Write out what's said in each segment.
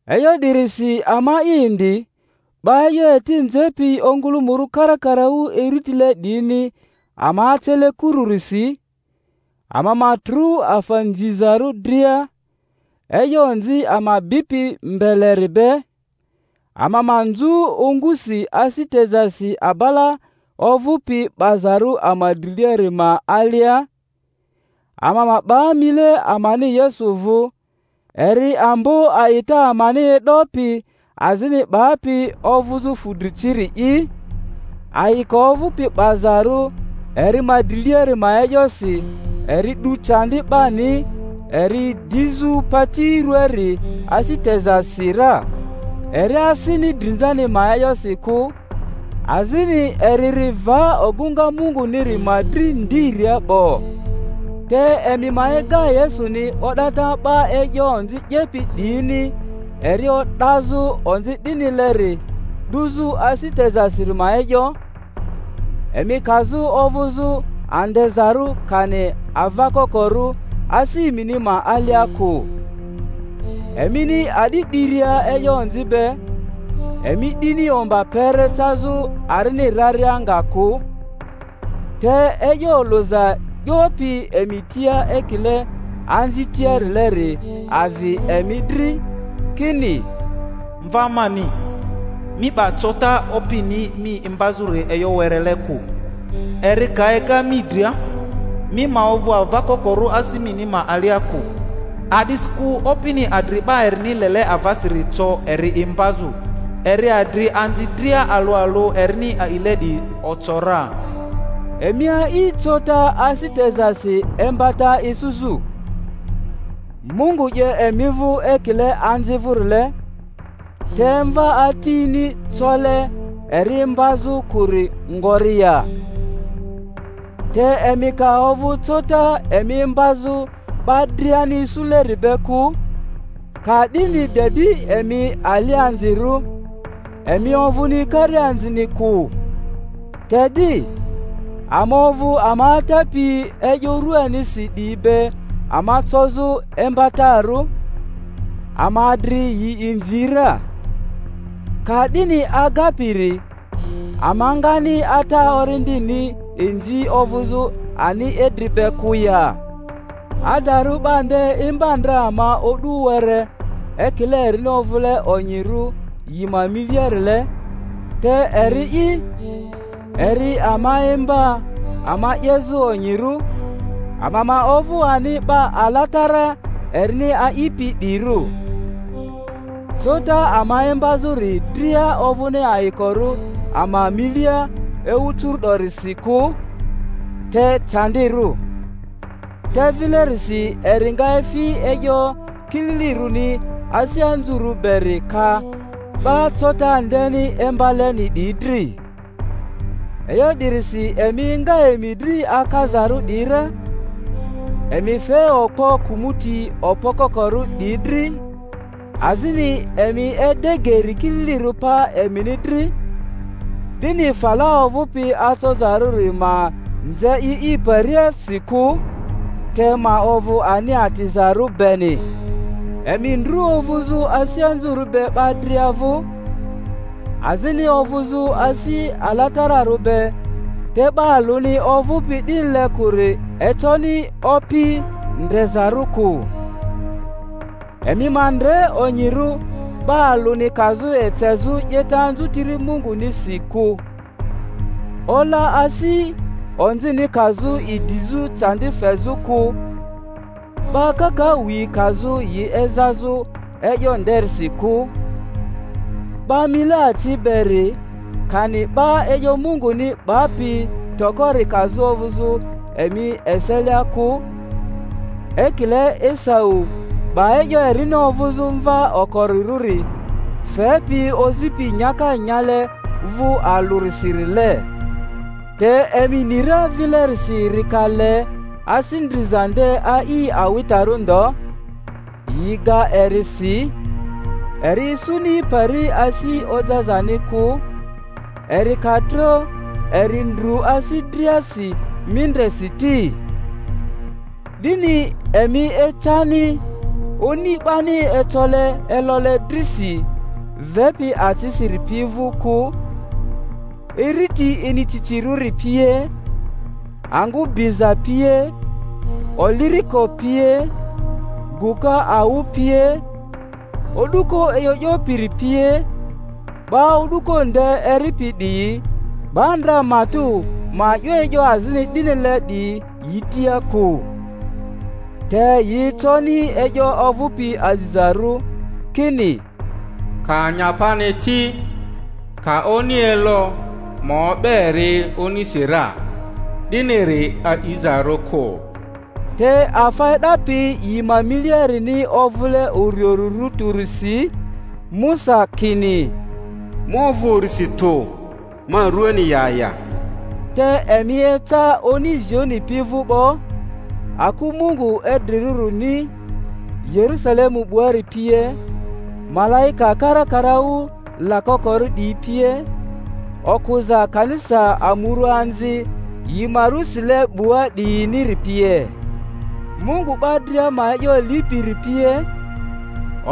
E'yo 'dirisi ama'i indi, 'ba e'yo eti nzepi ongᴜlᴜmᴜrᴜ karakaraᴜ iritile 'diyini ama acele kururisi, ama ma trᴜ afa nzizarᴜ dria, e'yo onzi ama bipi mbeleri be, ama ma nzᴜ ongusi asi tezasi abala ovᴜpi 'bazarᴜ ama driliari ma alia, ama ma 'ba mile amani Yesu vᴜ, eri ambo a'ita amani e'dopi azini 'bapi ovᴜzᴜ fᴜdri ciri'i, ayiko ovᴜpi 'bazarᴜ eri ma driliari ma e'yosi eri 'du candi 'bani eri dizᴜ pati ruaari asi tezasi ra, eri asini drinzani ma e'yosi kᴜ, azini eri ri va ogᴜŋa Munguniri ma dri ndiria 'bo. Te emi ma ega Yesuni o'data 'ba e'yo onzi 'yepi 'diyini eri o'dazᴜ onzi 'dinileri 'duzᴜ asi tezasiri ma e'yo, emi kazᴜ ovᴜzᴜ andezarᴜ kani ava kokorᴜ asi emini ma alia kᴜ. Emini a'di 'diria e'yo onzi be, emi 'dini omba kpere cazᴜ arini raria nga kᴜ. Te e'yo olᴜza 'yopi emi tia ekile anzi tiarileri avi emi dri, kini, Mva mani, mi 'ba cota Opini mi imbazᴜri e'yo werele kᴜ, eri ka ega mi dria, mi ma ovᴜ ava kokorᴜ asi mini ma alia kᴜ. A'disikᴜ Opini adri 'ba erini lele avasiri co eri imbazᴜ, eri adri anzi dria alᴜ alᴜ erini a'ile 'diyi oco ra. Emi a'i cota asi tezasi imbata isuzᴜ. Mungu 'ye emi vᴜ ekile anzi vᴜrile; te mva atini cole eri imbazᴜ kᴜri ngori ya? Te emi ka ovᴜ cota emi imbazᴜ 'ba driani isuleri be kᴜ, ka'dini de di emi alianzirᴜ, emi ovᴜni karianzini kᴜ. Te di, ama ovᴜ ama atapi e'yo ruanisi 'diyi be ama cozᴜ imbatarᴜ, ama adri yi inzi ra. Ka'dini agapiri ama ngani Ata orindini inzi ovᴜzᴜ ani idri be kᴜ ya? Adarᴜ 'ba nde imba ndra ama o'du were ekile erini ovᴜle onyirᴜ yi ma miliarile, te eri'i, eri ama imba ama 'yezᴜ onyirᴜ, ama ma ovᴜ ani 'ba alatara erini a'ipi 'diyirᴜ. Cota ama imbazᴜri dria ovᴜni ayikorᴜ ama inilia ewu curu'dorisi kᴜ, te candirᴜ; te vilerisi eri nga efi e'yo kililirᴜni asi anzurᴜ beri ka 'ba cota ndeni imbaleni 'diyi dri. E'yo 'dirisi emi enga emi dri akazarᴜ 'diyi ra, emi fe okpo kᴜmᴜti okpo kokorᴜ 'diyi dri, azini emi ede geri kililirᴜ pa emini dri, 'dini fala ovᴜpi acozarᴜri ma nze i i pariasi kᴜ, te ma ovᴜ ani atizarᴜ beni. Emi ndru ovᴜzᴜ asi anzurᴜ be 'ba dria vᴜ; azini ovᴜzᴜ asi alatararᴜ be, te 'ba alᴜni ovᴜpi 'dinile kᴜri econi Opi ndrezarᴜ kᴜ. Emi ma ndre onyirᴜ 'ba alᴜni kazᴜ ecezᴜ 'yeta anzutiri Mungunisi kᴜ; ola asi onzini kazᴜ idizᴜ candi fezᴜ kᴜ, 'ba kakaᴜ yi kazᴜ yi ezazᴜ e'yo nderisi kᴜ; 'ba mile aci beri, kani 'ba e'yo Munguni 'bapi tokori kazᴜ ovᴜzᴜ emi eselia kᴜ, ekile Esau 'ba e'yo erini ovᴜzᴜ mva okorirᴜri fepi ozipi nyaka nyale vᴜ alᴜrisirile. Te emi ni ra vilerisi eri ka le asi ndriza nde a'i awitarᴜ ndo, yi ga eri si, eri isuni pari asi ojazani kᴜ, eri ka tro eri ndru asi driasi mindresi ti. 'Dini emi ecani oni 'bani ecole elole drisi, vepi acisiri pi vᴜ kᴜ, iriti inicicirᴜri pie, angᴜ biza pie, oliriko pie, gᴜka awᴜ pie, o'duko e'yo 'yopiri pie; 'ba o'duko nde eripi 'diyi 'ba ndra matᴜ ma 'yo e'yo azini 'dinile 'diyi yi tia kᴜ. Te yi econi e'yo ovᴜpi azizarᴜ, kini, Ka anyapani ti, ka oni elo, ma o'be eri onisi ra, 'diniri a'izarᴜ kᴜ. Te afa e'dapi yi ma miliarini ovᴜle uriurirᴜ tᴜrisi, Musa kini, Ma ovᴜ urisi tᴜ, ma ruani ya ya. Te emi eca oni Zioni pi vᴜ 'bo, aku Mungu idrirᴜrini, Yerusalemu 'buari pie, malaika karakaraᴜ lakokorᴜ 'diyi pie, okᴜza kanisa amuruaanzi yi ma ru sile 'bua 'diyiniri pie, Mungu 'ba dria ma e'yo lipiri pie,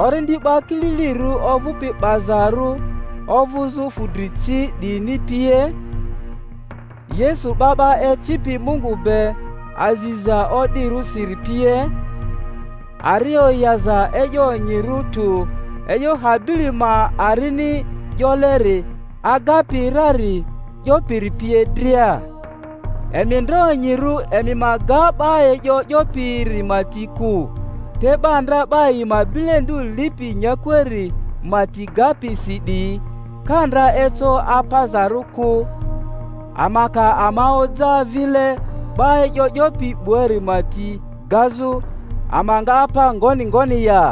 orindi 'ba kililirᴜ ovᴜpi 'bazarᴜ ovᴜzᴜ fudri ci 'diyini pie, Yesu 'ba 'ba ecipi Mungu be aziza o'dirᴜsiri pie, ari oyaza e'yo onyirᴜ tᴜ e'yo Habili ma arini 'yoleri agapi rari 'yopiri pie dria. Emi ndre onyirᴜ emi ma ga 'ba e'yo 'yopiri ma ti kᴜ. Te 'ba ndra 'ba yi ma bilendu lipi nyakuari ma ti gapi si 'diyi ka ndra eco apazarᴜ kᴜ, ama ka ama oja vile 'ba e'yo 'yopi 'buari ma ti gazᴜ ama nga apa ngoni ngoni ya?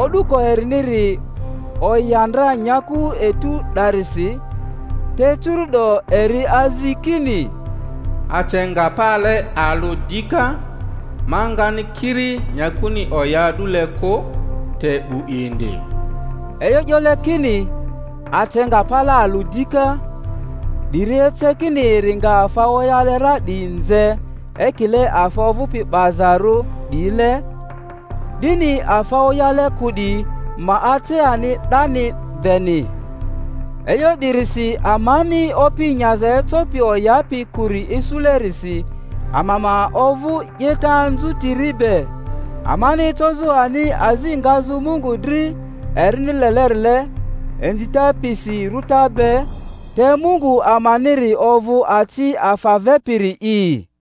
O'duko eriniri oya ndra nyaku etu 'darisi; te curu’do eri azi kini, Ace nga pale alᴜ dika ma nga ni kiri nyakuni oya a'dule kᴜ, te 'bu indi. E'yo 'yole kini, Ace nga pale alᴜ dika, 'diri ece kini eri nga afa oyale ra 'diyi nze ekile afa ovᴜpi 'bazarᴜ 'diyile, 'dini afa oyale kᴜ 'diyi ma ace ani 'dani beni. E'yo 'dirisi amani opi nyaza ecopi oyapi kᴜri isulerisi ama ma ovᴜ 'yeta anzutiri be, amani ecozᴜ ani azi ngazᴜ Mungu dri erini lelerile, inzita pisi rᴜta be; te Mungu amaniri ovᴜ aci afa vepiri'i.